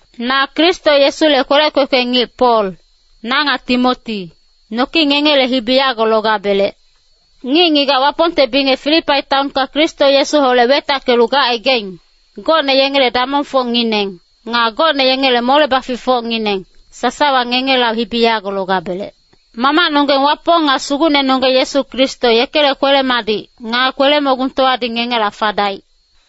Na Kristo Yesule kwelec kwekwe ngic Pol, na nga Timoti, noki ngengele hibi yago logabelec. Ngic-ngigac Wapongte bingec Filipai taonka Kristo Yesuholec wetackelu gacaigaing, gocne yengele damongfocngineng, nga gocne yengele mole-baficfocngineng, sasawa ngengela hibi yago logabelec. Mamacnonggeng Wapong nga Sugucnenonggeng Yesu Kristo yekele kwele-madic, nga kwele-mogungtowadi ngengela fadaic.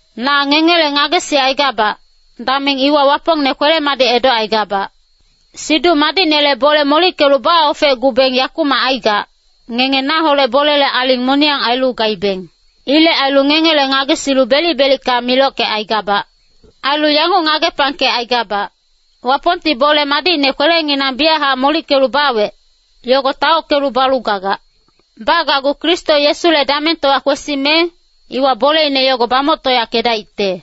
Na ngengele ngagesicaigabac, dameng iwa Wapongne kwele-madic edocaigabac. Siduc Madicnele bole molickelu baofecgubeng yakumac aigac, ngenge naholec bolele aling moniyang ailu gaibeng. Ilec ailu ngengele ngagesilu belic-belicka milockecaigabac. Ailu yanguc ngagepangkecaigabac, Wapongti bole madicne kwelenginang biyachac molickelu bawec, yogo taockelu balu gagac. Bagacgu Kristo Yesule damengtowa kwesime, iwa boleine yogo bamoctoyackedaicte.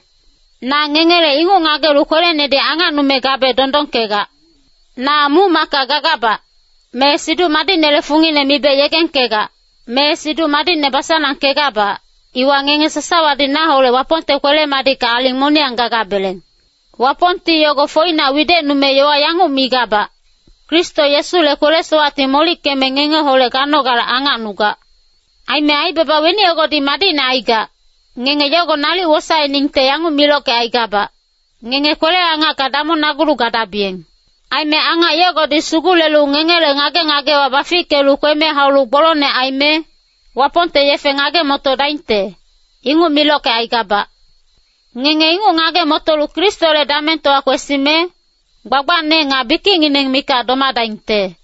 Na ngengele inguc ngagelu kwelenedi angacnume gabe dondongkegac. Na muc-macka gagabac, me Siduc Madicnele fungine mibe yegengkegac, me Siduc Madicne basanangkegabac, iwa ngenge sasawadi naholec Wapongte kwele-madicka aling moniyang gagabeleng. Wapongti yogo foinac widecnume yowa yanguc migabac, Kristo Yesule kwele-sowacti molickeme ngengeholec ganogale angacnugac. Aime aibaba weni yogodi madicne aigac, ngenge yogo nalic wosaeningte yanguc milockecaigabac, ngenge kwele-angacka damongnagulu gadabiyeng. Aime angac yogodi sugulelu ngengele ngage-ngagewa bafickelu kweme haulu gbolongne aime, Wapongte yefe ngage-motodaingte, inguc milockecaigabac. Ngenge inguc ngage-motolu Kristole damengtowa kwesime, gbagbacne nga bikicngineng mikac domadaingte.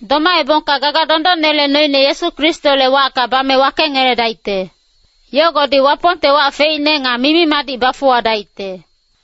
Domaebongka gaga dondonnele noine Yesu Kristole wacka bame wakengeledaicte. Yogodi Wapongte wac feicne nga mimi-madic bafuwadaicte.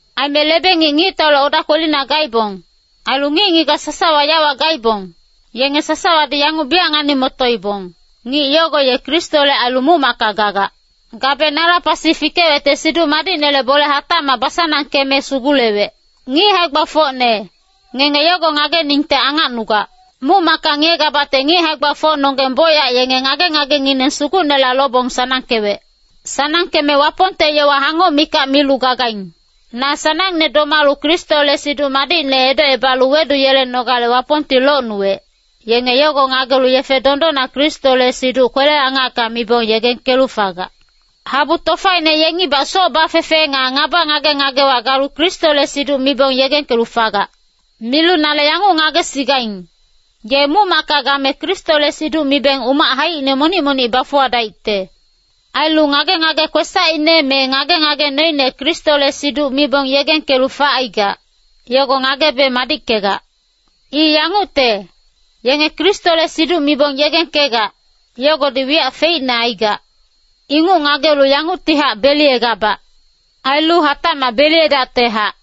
Aime lebe-ngic ngictaule oda kwelina gaibong, ailu ngic-ngigac sasawa yawa gaibong, yenge sasawadi yanguc biyac ngani-motoibong, ngic yogo ye Kristole ailu muc-macka gagac. Gabe nala pasi fikewecte Siduc Madicnele bole hatacmac basanangkeme sugulewec. Ngic hae-gbafocne, ngenge yogo ngageningte angacnugac. Muc-macka ngiyegabacte ngic hae-gbafocnonggeng bocyac yenge ngage-ngagengineng Sugucnela lobong sanangkewec. Sanangkeme Wapongte yowa hangoc mikac milu gagaing. Na sanangne domalu Kristole Siduc Madicne edocebalu weduyelenogale Wapongti locnuwec, yenge yogo ngagelu yefe dondonna Kristole siduc kwele-angacka mibong yegengkelu fagac. Habu tofaine yengibac soc bafefe nga ngaba ngage-ngagewa galu Kristole siduc mibong yegengkelu fagac. Milu nale yanguc ngagesigaing, ye muc-macka game Kristole siduc mibeng umac haicine monic-monic bafuwadaicte. Ailu ngage-ngage kwesacine me ngage-ngage noine Kristole siduc mibong yegengkelu facaigac, yogo ngagebe madickegac. I yangucte, yenge Kristole siduc mibong yegengkegac, yogodi wiyac feicne aigac. Inguc ngagelu yanguctihac beliyegabac. Ailu hatacmac beliyedactehac.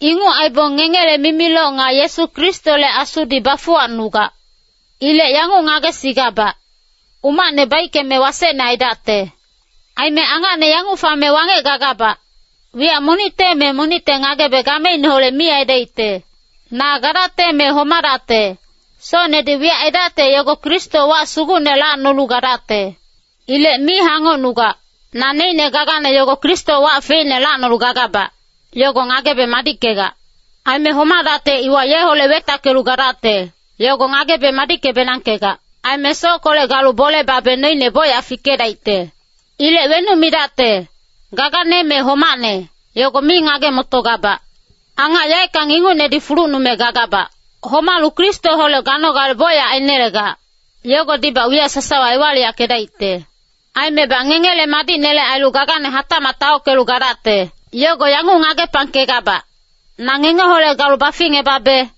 Inguc aibong ngengele mimiloc nga Yesu Kristole Asudi bafuwacnugac. Ilec yanguc ngagesigabac, umacne baickeme wasecne aidacte. Aime angacne yanguc fame wangec gagabac, wiyac monicte me monicte ngagebe gameineholec mi aidaicte. Na gadacte me homadacte, socnedi wiyac aidacte yogo Kristo wac sugucne lacnolu gadacte. Ilec mi hangocnugac. Naneicne gagane yogo Kristo wac feicne lacnolu gagabac, yogo ngagebe madickegac. Aime homadacte iwa yeholec wetackelu gadacte, yogo ngagebe madicke-benangkegac. Aime sockolec galu bole babe noine bocyac fikedaicte. Ilec wenuc midacte, gagane me homacne, yogo mi ngage-motogabac. Angac yaeckang ingucnedi fulucnume gagabac. Homalu Kristoholec ganogale bocyac ainelegac, yogodibac wiyac sasawa ewaliyackedaicte. Aimebac ngengele madicnele ailu gagane hatacmac taockelu gadacte. Yogo yanguc ngagepangkegabac, na ngengeholec galu baficngebabe,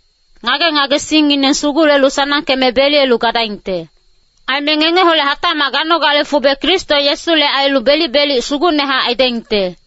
ngage-ngagesingngineng sugulelu sanangkeme beliyelu gadaingte. Aime ngengeholec hatacmac ganogale fube Kristo Yesule ailu belic-belic sugucnehac aidaingte.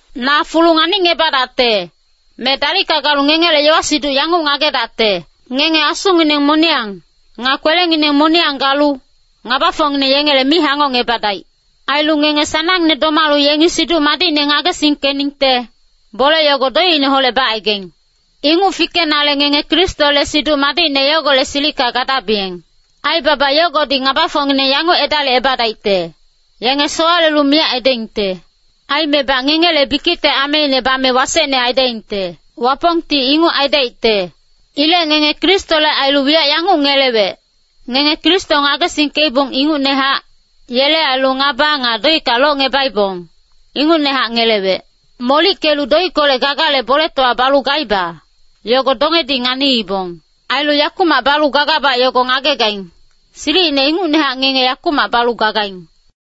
Na fulu nganicngebadacte, me dalicka galu ngengele yowa-siduc yanguc ngagedacte. Ngenge asungineng moniyang, nga kwelengineng moniyang galu, ngabafocngineng yengele mi hangocngebadaic. Ailu ngenge sanangne domalu yengi Siduc Madicne ngagesingkeningte, bole yogo doicineholec bacaigaing. Inguc fikenale ngenge Kristole Siduc Madicne yogolec silicka gadabiyeng. Aibaba yogodi ngabafocngineng yanguc edalicebadaicte, yenge sowalelu miyac aidaingte. Aimebac ngengele bikicte ameine bame wasecne aidaingte. Wapongti inguc aidaicte. Ilec ngenge Kristole ailu wiyac yanguc ngelewec, ngenge Kristo ngagesingkeibong ingucnehac, yele ailu ngaba nga doicka locngubaibong, ingucnehac ngelewec. Molickelu doickolec gagale boletowa balu gaiba, yogo dongedi nganiibong. Ailu yakumac balu gagabac yogo ngagegaing, silicine ingucnehac ngenge yakumac balu gagaing.